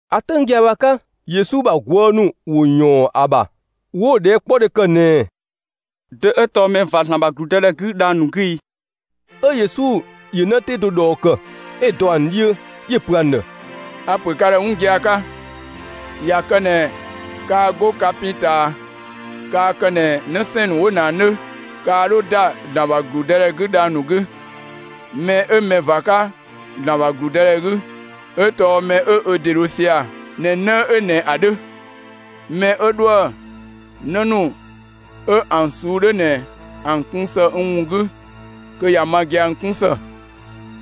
‑A 'töng gia‑ bhë ‑a 'ka, Yesu ‑bha ꞊guë' ‑nu ‑wo ‑yɔɔn ‑a ‑bha 'wo‑ ꞊dhɛɛkpɔdhe ‑kë ꞊nɛɛ: «Dö 'ö tɔɔ mɛ ꞊va ‑Zlan ‑bha ‑gludëdhɛ 'gü dhang‑ ‑nu 'gü i?» 'Ö Yesu ‑yö 'në 'tee do ꞊dhɔɔ ‑kë, 'ö‑ dɔ ‑an 'dhiö; 'yö‑ pö ‑an ‑dhë: «A‑ ‑pö ka ‑dhë 'wun gia‑ 'ka: ꞊Ya kë ꞊nɛ kaa 'go ka pin ꞊taa kaa kë ꞊nɛ 'në 'sɛɛn‑ ‑nu 'wo ꞊nɛ ‑an 'dhö, kaa 'dho ‑da ‑Zlan ‑bha ‑gludëdhɛ 'gü dhang‑ 'gü. Mɛ 'ö mɛ ꞊va 'ka ‑Zlan ‑bha ‑gludëdhɛ 'gü, 'ö tɔɔ mɛ 'ö ö ‑de dho sia‑ ꞊nɛ 'në 'ö ꞊nɛ ‑a 'dhö. Mɛ 'ö 'dhoë‑ 'në ‑nu 'ö ‑an ꞊suu'‑ 'dhö ꞊nɛ ‑an kun ‑së n ‑wun 'gü, kö ꞊ya ma gia‑ n 'kun ‑së.»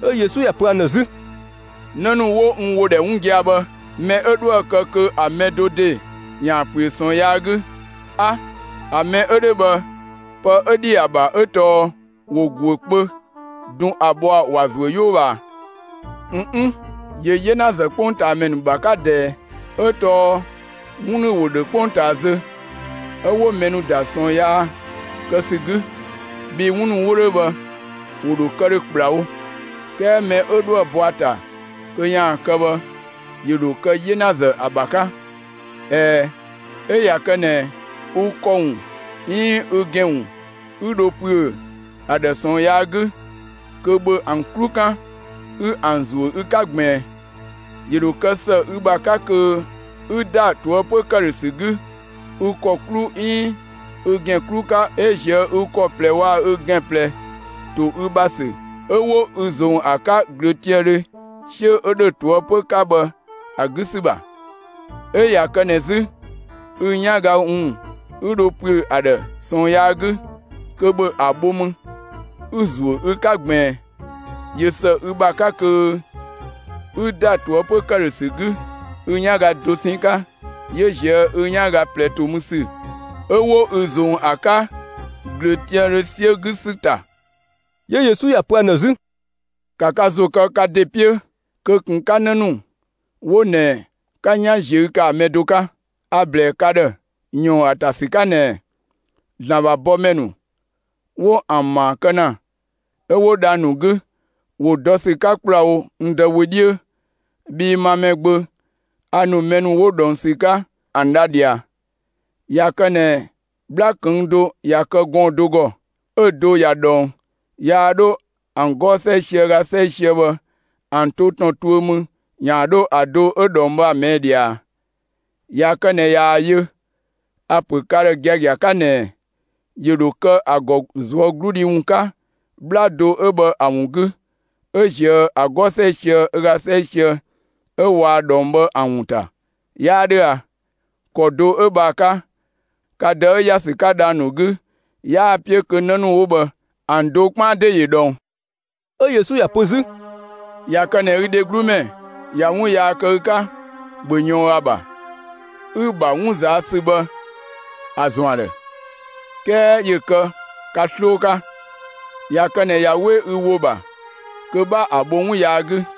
'Ö Yesu ‑ya pö ‑an ‑dhë 'zü: «'Në ‑nu 'wo n ‑wo ‑dhɛ 'wun gia‑ bhë, mɛ 'ö 'dhoë‑ kë kö ‑a mɛ do ‑de ‑yaan ‑püö ꞊sɔɔn yaa 'gü, 'a, ‑a mɛ 'ö 'dhö bhë pë 'ö ‑dhi ‑a ‑bha 'ö tɔɔ ‑wo ‑güö kpö dun ‑a bhɔa‑ ‑wa ‑zuö 'yoo ꞊bhaa. ꞊N 'n! ‑Yö 'yenazë 'kpongtaamɛ ‑nu ‑bha 'ka ꞊dhɛɛ, 'ö tɔɔ 'wun ‑nu ‑wo ‑dhö 'kpongtaa zö, 'ö 'wo mɛ ‑nu ‑da ꞊sɔɔn yaa kë ‑sü 'gü. Bhii 'wun ‑nu 'wo 'dhö bhë, ‑wo ‑dho kë ‑dhö ‑kplawo, 'kɛɛ mɛ 'ö 'dhoë‑ bɔ ‑a ‑ta kö ‑yaan kë bhë, ‑yö ‑dho kë 'yenazë ‑a ‑bha 'ka! ꞊Ɛɛ, 'ö ꞊ya kë ꞊nɛ ü ‑kɔ ‑wun 'iin ü ‑gɛn ‑wun 'ü dho ‑püö ‑a ‑dhë ꞊sɔɔn yaa 'gü, kö ‑bhö ‑an 'klu 'kan 'ü ‑an ‑zuö ü 'ka ꞊gbiin! ‑Yö ‑dho kë ‑së ü ‑bha 'ka kö 'ü ‑da ꞊toëpö ‑këdhösü 'gü ü ‑kɔ 'klu 'iin ü ‑gɛn 'klu 'ka 'ö ꞊zië' ü ‑kɔ ꞊plɛ waa‑ ü ‑gɛn ꞊plɛ ‑to ü ‑bha ‑sü 'ö 'wo ü ꞊zong ‑a 'ka ꞊glöötiaandhö 'siö 'ö ‑dhö ꞊toëpö 'ka bhë ‑a 'gü ‑sü ‑bha. 'Ö ꞊ya kë ꞊nɛ 'zü, ü 'yanga ‑wun 'ü dho ‑püö ‑a ‑dhë ꞊sɔɔn yaa 'gü, kö ‑bhö ‑a bho mü 'ü‑ ‑zuö ü 'ka ꞊gbiin! ꞊Yö ‑së ü ‑bha 'ka kö 'ü ‑da ꞊toëpö ‑këdhösü 'gü ü 'yanga dosɛn 'ka, 'yö ꞊zië' ü 'yanga ꞊plɛ ‑to mü ‑sü 'ö 'wo ü ꞊zong ‑a 'ka ꞊glöötiaandhö 'siö 'gü ‑sü ‑ta.» 'Yö Yesu ‑ya pö ‑an ‑dhë 'zü: «‑Ka ka ‑zo kë ka ‑de 'piö kö ꞊kun 'ka 'në ‑nu 'wo ꞊nɛ 'ka 'yan ꞊ziö' kë ‑a mɛ do 'ka! A‑ ‑blɛɛ ka ‑dhë ‑yɔɔn ‑a ‑ta ‑sü 'ka ꞊nɛɛ: ‑Zlan ‑bha bɔmɛ ‑nu 'wo ‑an ‑maa kë ‑na 'ö 'wo dhang‑ ‑nu 'gü, ‑wo dɔ ‑sü 'ka ‑kplawo n Dë wö 'dhiö. [Bhii ma Mɛgbö, a ‑nu mɛ ‑nu 'wo dhɔng ‑sü 'ka ‑an dha ꞊dhia.] ꞊Ya kë ꞊nɛ 'bhla ꞊këng' do ꞊ya kë gɔɔn‑ do ‑gɔ, 'ö‑ do ꞊ya ꞊dhɔng, yaa 'dho ‑an 'gɔɔ‑ 'sɛisië ö ga 'sɛisië bhë ‑an to ‑tɔn tuö mü ‑yaan 'dho ‑a do 'ö ꞊dhɔng bhë ‑a ꞊mɛɛ' ꞊dhia ꞊a? ꞊Ya kë ꞊nɛ ꞊yaa‑ yö, a‑ ‑pö ka ‑dhë gia‑ 'ka ꞊nɛɛ: ‑Yö ‑dho kë ‑a ‑gɔ ꞊zuögludhi ‑wun 'ka 'bhla do 'ö bhë ‑a ‑wun 'gü, 'ö ꞊zië' ‑an 'gɔɔ‑ 'sɛisië ö ga 'sɛisië 'ö waa ꞊dhɔng bhë ‑an ‑wun ‑ta; 'yaa 'dhö a? ‑Kɔ do 'ö bhë ‑a 'ka, ka Dë 'ö ‑ya ‑sü 'ka dhang‑ ‑nu 'gü 'yaa‑ 'piö kö 'në ‑nu 'wo bhë ‑an do 'kpaan ‑de ‑yö ꞊dhɔng.» 'Ö Yesu ‑ya pö 'zü: «꞊Ya kë ꞊nɛ ü dheglu ‑mɛ ꞊ya 'wun yaa kë ü 'ka, ‑bhö ꞊yɔɔn ‑a ‑bha, 'ü‑ ‑bha 'wun ꞊zaa' ‑sü bhë ‑a ‑zɔn ‑a ‑dhë; 'kɛɛ ‑yö kë ka 'sloo 'ka. ꞊Ya kë ꞊nɛ ꞊ya 'we ü ‑wo ‑bha kö 'bha ‑a bho 'wun yaa 'gü.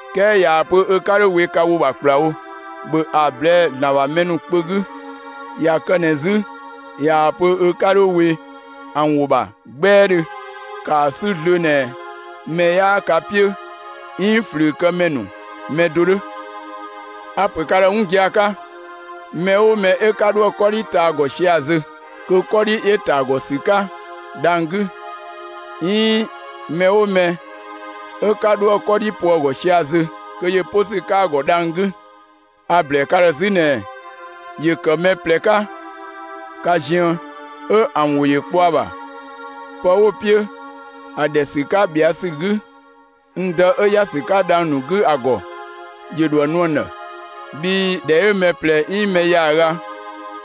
'Kɛɛ ꞊yaa‑ pö ö 'ka 'dho we ka ‑wo ‑bha ‑kplawo, ‑bhö ‑a ꞊blɛɛ'‑ ‑Zlan ‑bha mɛ ‑nu kpö 'gü! ꞊Ya kë ꞊nɛ 'zü ꞊yaa‑ pö ö 'ka 'dho we ‑an ‑wo ‑bha 'gbɛɛdhö, ‑kaa 'sü zlöö ꞊nɛ mɛ 'yaa ka 'piö, 'iin ꞊flüükëmɛ ‑nu mɛ do 'dhö. A‑ ‑pö ka ‑dhë 'wun gia‑ 'ka: Mɛ 'oo mɛ 'ö 'ka 'dhoë‑ 'kɔdhi ta ‑a ‑gɔ sia‑ zö, kö 'kɔdhi ‑yö ‑ta ‑a ‑gɔ ‑sü 'ka dhang‑ 'gü. 'Iin mɛ 'oo mɛ 'ö 'ka 'dhoë‑ 'kɔdhi po ‑a ‑gɔ sia‑ zö, kö ‑yö 'po ‑sü 'ka ‑a ‑gɔ dhang‑ 'gü. A‑ ‑blɛɛ ka ‑dhë 'zü ꞊nɛɛ: ‑Yö ‑kë mɛ ꞊plɛ 'ka ka ziën, 'ö ‑an ‑wo ‑yö kpɔ ‑a ‑bha pë 'wo‑ 'piö ‑a ‑dhɛ ‑sü 'ka ꞊bhɛa' ‑sü 'gü n Dë 'ö ‑ya ‑sü 'ka dhang‑ ‑nu 'gü ‑a ‑gɔ, ‑yö ‑dho ‑a nu ‑an ‑dhë. Bhii ‑dhɛ 'ö mɛ ꞊plɛ 'iin mɛ ‑yaaga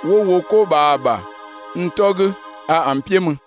'wo wo 'ko ꞊bhaa ‑a ‑bha n 'tɔ 'gü, a ‑an 'piö mü.»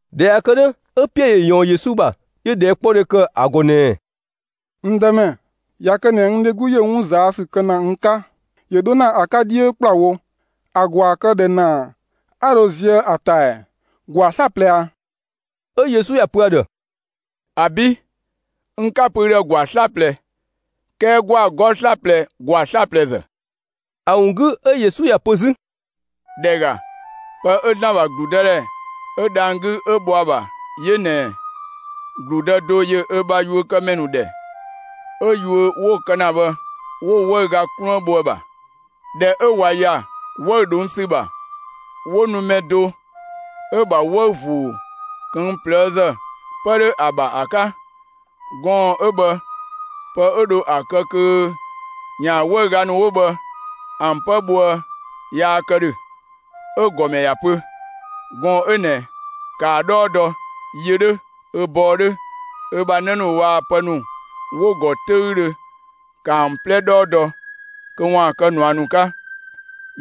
꞊Dhɛ ꞊ya kë 'dhö, 'ö Piɛɛ ‑yö ꞊yɔɔn Yesu ‑bha, 'yö ꞊dhɛɛkpɔdhe ‑kë ‑a ‑gɔ ꞊nɛɛ: «N Dëmɛ, ꞊ya kë ꞊nɛ n dheglu ‑yö 'wun ꞊zaa' ‑sü kë ‑na n 'ka, ‑yö 'dho ‑na ‑a 'ka 'dhiö ‑kplawo, ‑a ‑gwaa kë ꞊dhë ‑naa 'a dho ziëë ‑a ‑ta ɛɛ? ‑Gwaa 'slaplɛ ꞊a?» 'Ö Yesu ‑ya pö ‑a ‑dhë: «‑Abi'! N 'ka‑ pö ü ‑dhë ‑gwaa 'slaplɛ, 'kɛɛ ‑gwaa 'gɔɔ‑ 'slaplɛ ‑gwaa 'slaplɛzë.» ‑A ‑wun 'gü 'ö Yesu ‑ya pö 'zü: «‑Dhɛ ‑ga, pë 'ö ‑Zlan ‑bha ‑gludëdhɛ 'ö dhang‑ 'gü 'ö bhɔ ‑a ‑bha 'yö ꞊nɛɛ: ‑Gludë do ‑yö ö bha yuökëmɛ ‑nu ‑dhɛ, 'ö yuö 'wo‑ kë ‑na bhë, 'wo‑ 'wëüga 'kluën bho ‑a ‑bha. ꞊Dhɛ 'ö ꞊wa ‑ya 'wëü‑ ꞊dhong' ‑sü ‑bha, 'wo nu mɛ do 'ö‑ ‑bha 'wëü‑ ‑vuu ꞊këng' ꞊plëëzë 'pë 'dho ‑a ‑bha ‑a 'ka. Gɔɔn‑ 'ö bhë pë 'ö dho ‑a kë kö ‑yaan 'wëüga ‑nu 'wo bhë ‑an 'pë bhoë yaa kë ‑dhö. 'Ö‑ ‑gɔmɛ ‑ya pö: ‹Gɔɔn‑ 'ö ꞊nɛ, ‑kaa 'dhɔɔ dɔ, yö 'dhö, ö bɔɔ 'dhö, ö ‑bha 'në ‑nu waa‑ pë ‑nu 'wo‑ ‑gɔ 'töüdhö; ‑ka ‑an 'plɛ 'dhɔɔ dɔ kö ‑waan kë ꞊nua ‑nu 'ka.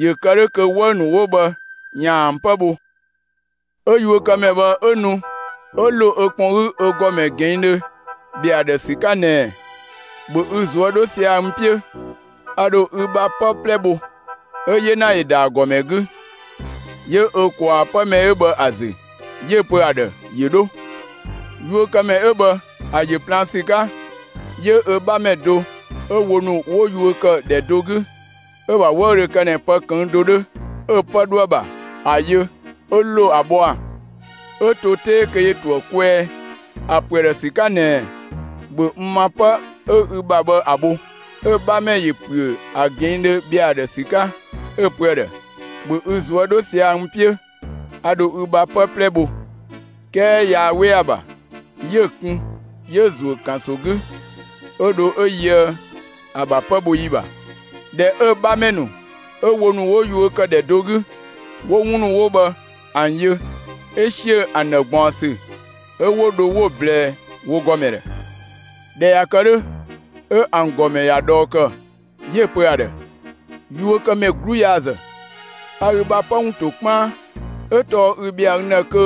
‑Yö kë 'dhö kö 'wëü‑ ‑nu 'wo bhë ‑yaan ‑an 'pë bho.› 'Ö yuökëmɛ bhë 'ö nu 'ö ‑lo ö kpɔn 'gü ö ‑gɔmɛ ꞊gɛɛndhö ‑bhɛa ‑a ‑dhë ‑sü 'ka ꞊nɛɛ: ‹‑Bhö ü ꞊zuö' 'dho sia‑ n 'piö, a ‑dho ü bha 'pë 'plɛ bho!› 'Ö‑ 'yena ‑yö ‑da ‑a ‑gɔmɛ 'gü, 'yö ö ꞊kwaa 'pë mɛ 'ö bhë ‑a ‑zü, 'yö‑ pö ‑a ‑dhë ‑yö 'dho. Yuökëmɛ 'ö bhë, ‑a ‑yö plaan ‑sü 'ka, 'yö ö 'bhamɛ do 'ö wo ‑nu 'wo yuö ‑kë ‑dhɛ do 'gü, 'ö‑ ‑bha 'wëü‑ 'ö dho kë ꞊nɛ pë ꞊këng' do 'dhö 'ö‑ 'pë 'dhoë‑ ‑bha, ‑a yö. 'Ö ‑lo ‑a bhɔa, 'ö to 'tee kö ‑yö ‑to ‑a kwɛɛ, ‑a pö ‑a ‑dhë ‑sü 'ka ꞊nɛɛ: ‹‑Bhö n ‑ma 'pë 'ö ü ‑bha bhë ‑a bho!› 'Ö‑ 'bhamɛ ‑yö ‑püö ‑a ꞊gɛɛndhö ‑bhɛa ‑a ‑dhë ‑sü 'ka, 'ö‑ pö ‑a ‑dhë: ‹‑Bhö ü ꞊zuö' 'dho sia‑ n 'piö, a ‑dho ü bha 'pë 'plɛ bho!› 'Kɛɛ yaa 'we ‑a ‑bha, 'yö‑ kun, 'yö‑ ‑zuö ‑kanso 'gü 'ö dho 'ö yöë ‑a ‑bha 'pë bho ‑yi ‑bha. ꞊Dhɛ 'ö‑ 'bhamɛ ‑nu 'ö wo ‑nu 'wo yuö ‑kë ‑dhɛ do 'gü, ‑wo 'wun ‑nu 'wo bhë ‑an yö, 'ö ‑siö ‑an ‑dhë ꞊gbaɔnsü; 'ö 'wo dho 'wo‑ ꞊blɛɛ wo ‑gɔmɛ ‑dhë. ꞊Dhɛ ꞊ya kë 'dhö, 'ö ‑an ‑gɔmɛ ‑ya ꞊dhɔɔ ‑kë, 'yö‑ pö ‑a ‑dhë: ‹Yuökëmɛ 'gluyaazë! A ü bha 'pë ‑wun ‑to 'kpaan, 'ö tɔɔ ü ‑bhɛa n ‑dhë kö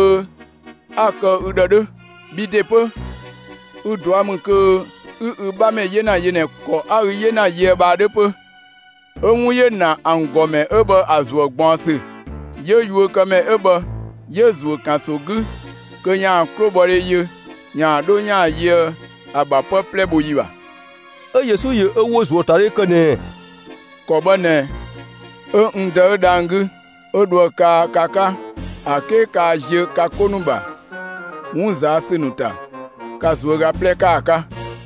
'a‑ kë ü ‑dhë 'dhö. Bhi ‑de 'pö, ü ꞊dua' ‑mü kö 'ü ü 'bhamɛ 'yena yö ꞊nɛ ‑kɔ 'a ü 'yena yöë bhë ‑a 'dhö 'pö!› 'Ö 'wun ‑yö ‑na ‑an ‑gɔmɛ 'ö bhë ‑a ‑zuë ꞊gbaɔnsü; 'yö yuökëmɛ 'ö bhë 'yö‑ ‑zuö ‑kanso 'gü kö ‑yaan 'klobhɔdhe yö ‑yaan 'dho ‑yaan yöë ‑a ‑bha 'pë 'plɛ bho ‑yi ‑bha.» 'Ö Yesu ‑yö ö ‑wo ‑zuöatadhe ‑kë ꞊nɛɛ: «‑Kɔ bhë ꞊nɛ, 'ö n Dë 'ö dhang‑ 'gü, 'ö dho ‑a kaa ka 'ka ‑a 'ke kaa ziö ka 'ko ‑nu ‑bha 'wun ꞊zaa' ‑sü ‑nu ‑ta ka ꞊zuöga 'plɛ 'ka ‑a 'ka.»